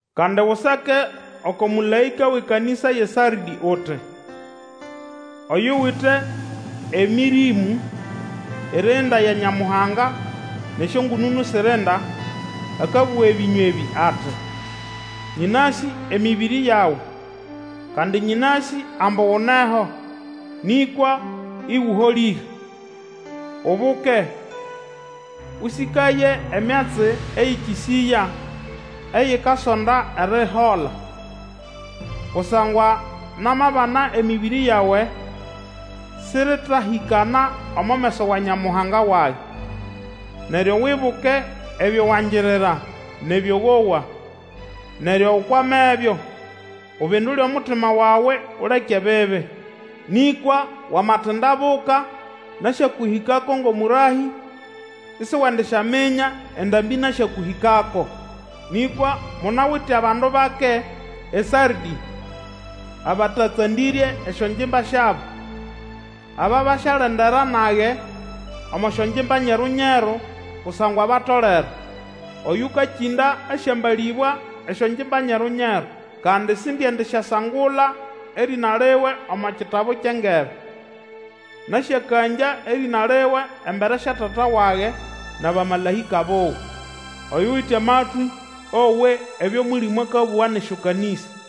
Kandi Usake oko mũlaĩka wʼekanĩsa yʼeSardĩ uti: Oyuwite Emĩrĩmũ irinda ya Nyamuhanga nʼesyongũnũnũ sirinda, akabũga ebĩnywa ebĩ ati, Nyĩnasĩ emĩbĩrĩ yawe, kandi nyĩnasĩ ambu uneho, nĩkwa ĩgũholĩre! Ubuke, Ũsĩkaye emyatsi eyĩkĩsĩya, eyikasonda erihola. Kusangwa namabana emĩbĩrĩ yawe sĩrĩtahĩkana omo meso wa Nyamuhanga wage. Neryo Wibuke ebyo wangirira, nʼebyo wowa, neryo ukwamebyo, ubindule omutima wawe uleke ebibi. Nĩkwa wamatindabuka, nasyakũhĩkako ngʼomũrahĩ, isiwendisyaminya endambĩ nasyakũhĩkako. Nĩkwa munawite abandu bake eSardĩ, abatatsandĩrye esyongimba syabo. Aba basyalendera nage omo syongimba nyeru-nyeru, kusangwa batolere. Oyũkakĩnda asyambalĩbwa esyongimba nyeru-nyeru, kandi sindiendisyasangula erĩna liwe omo kitabu kyʼengebe. Nasyakangya erĩna liwe embere sya Tata wage, nʼabamalaĩka buwe. Oyuwite amatwĩ, owe ebyo Mũlĩmũ akabũga nʼesyokanĩsa.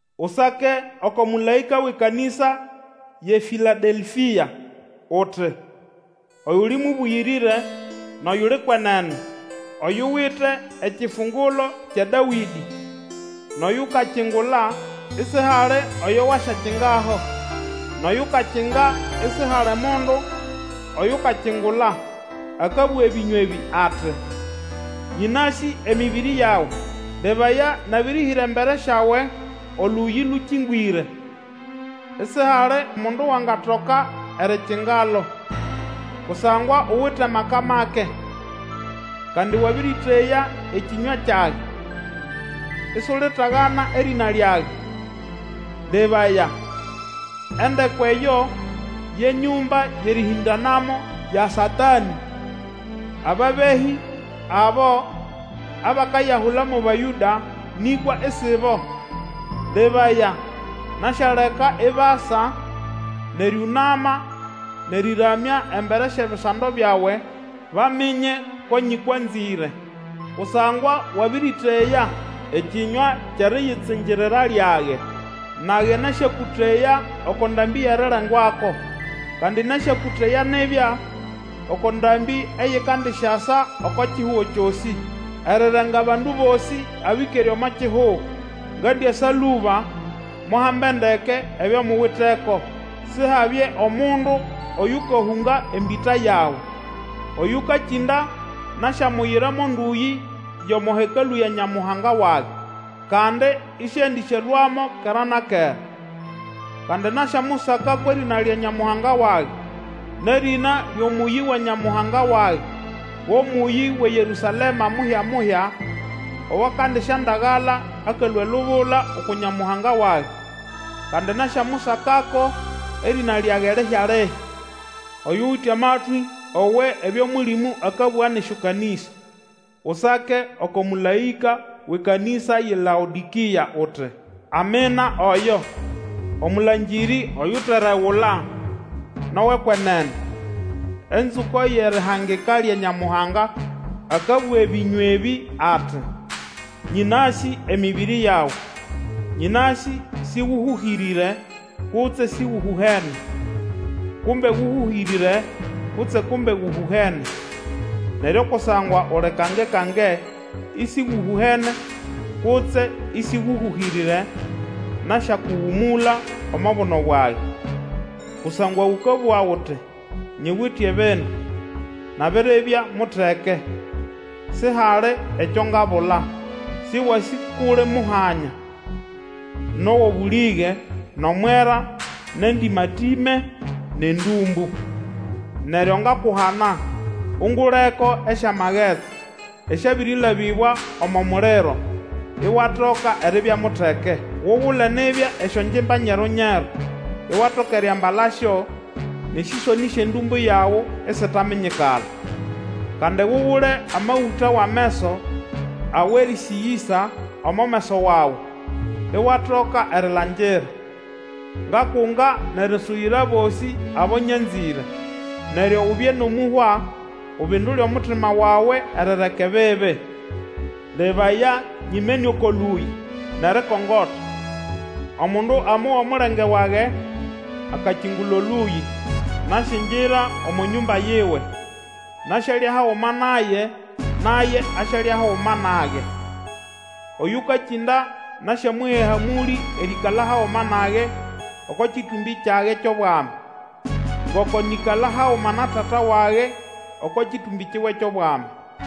Usake oko mũlaĩka wʼekanĩsa yʼeFĩladelfia, uti, Oyuli mũbũyĩrĩre, nʼoyuli kwenene, oyuwite ekifungulo kya Dawĩdĩ, nʼoyukakingula, isihali oyo wasyakingaho, nʼoyukakinga, isihali omundu oyukakingula, akabũga ebĩnywa ebĩ ati, Nyĩnasĩ emĩbĩrĩ yawe. Lebaya, nabĩrĩhĩra embere syawe Olũyĩ lũkĩngwĩre, isihali mundu wangatoka erikingalo, kusangwa uwite amaka make, kandi wabĩrĩteya ekĩnywa kyage, isulitagana erĩna lyage. Lebaya! Endeko eyo ye nyũmba yʼerĩhĩndanamo ya Satanĩ, ababehĩ abo, abakayahula mo Bayũda, nĩkwa isibo, lebaya, nasyaleka ibasa nʼerĩũnama nʼerĩramya embere syʼebisando byawe, baminye ko nyĩkwanzĩre. Kusangwa wabĩrĩteya ekĩnywa kyʼeriyitsingirira lyage, nage nasyakũteya oko ndambĩ yʼerirengwako, kandi nasyakũteya nibya oko ndambĩ eyikandisyasa oko kihugo kyosĩ, erirenga bandu bosĩ abĩkere omo kihugo. Ngandiasa lũba! Muhambe ndeke ebyo muwiteko, Sihabye omundu oyukahũnga embĩta yawe. Oyukakinda, nasyamuyira mo ndũyĩ yʼomo Hekalũ ya Nyamuhanga wage, kandi isiendĩsyalũamo kera na kera. Kandi nasyamusaka kwʼerĩna lya Nyamuhanga wage, nʼerĩna lyʼomũyĩ wa Nyamuhanga wage, go mũyĩ wʼeYerũsalema muhya-muhya, owakandisyandagala akalũa elubula uku Nyamuhanga wage. Kandi nasyamusakako erĩna lyage lihya-lihya. Oyuwite amatwĩ, owe ebyo Mũlĩmũ akabũga nʼesyokanĩsa! Usake oko mũlaĩka wʼekanĩsa yʼeLaodĩkĩa, uti: Amina oyo, Omũlangĩrĩ oyuteregula nʼowʼekwenene, Enzũko yʼerihangika lya Nyamuhanga, akabũga ebĩnywa ebĩ ati, Nyĩnasĩ emĩbĩrĩ yawe, nyĩnasĩ sĩgũhũhĩrĩre, kutse sĩgũhũhene. Kumbe gũhũhĩrĩre kutse kumbe gũhũhene! Neryo kusangwa uli kange-kange, ĩsĩgũhũhene, kutse ĩsĩgũhũhĩrĩre, nasyakũgũmũla omo buno bwage! Kusangwa ũkabũga uti, Nyiwite ebindu, nabiribya muteke, sihali ekyo ngabula. Sĩwasĩ kʼuli muhanya, nʼowʼobũlĩge, nʼomwera, nʼendĩma-tĩme nʼendũmbũ. Neryo ngakuhana unguleko esyamagetsi, esyabĩrĩlabĩbwa omo muliro, iwatoka eribya muteke. Ugule nibya esyongimba nyeru-nyeru, iwatoka eriambalasyo, nʼesĩsonĩ syʼendũmbũ yawe isitaminyikala. Kandi Ugule amagũta wʼameso awʼerĩsĩgĩsa omo meso wawe, iwatoka erilangira. Ngakunga nʼerisuyira abosĩ abo nyanzĩre. Neryo ubye nʼomũhwa, ubindule omutima wawe erireka ebibi. Lebaya! Nyinimene oko lũyĩ nʼerikongota; omundu amowa omulenge wage, akakingula Olũyĩ, nasyingira omo nyũmba yiwe, nasyalya haguma naye, naye asyalya haguma nage. Oyũkakĩnda, nasyamuha ehamũlĩ erĩĩkala haguma nage oko kĩtũmbĩ kyage kyʼobwami, ngoko nĩkala haguma na Tata wage oko kĩtũmbĩ kiwe kyʼobwami.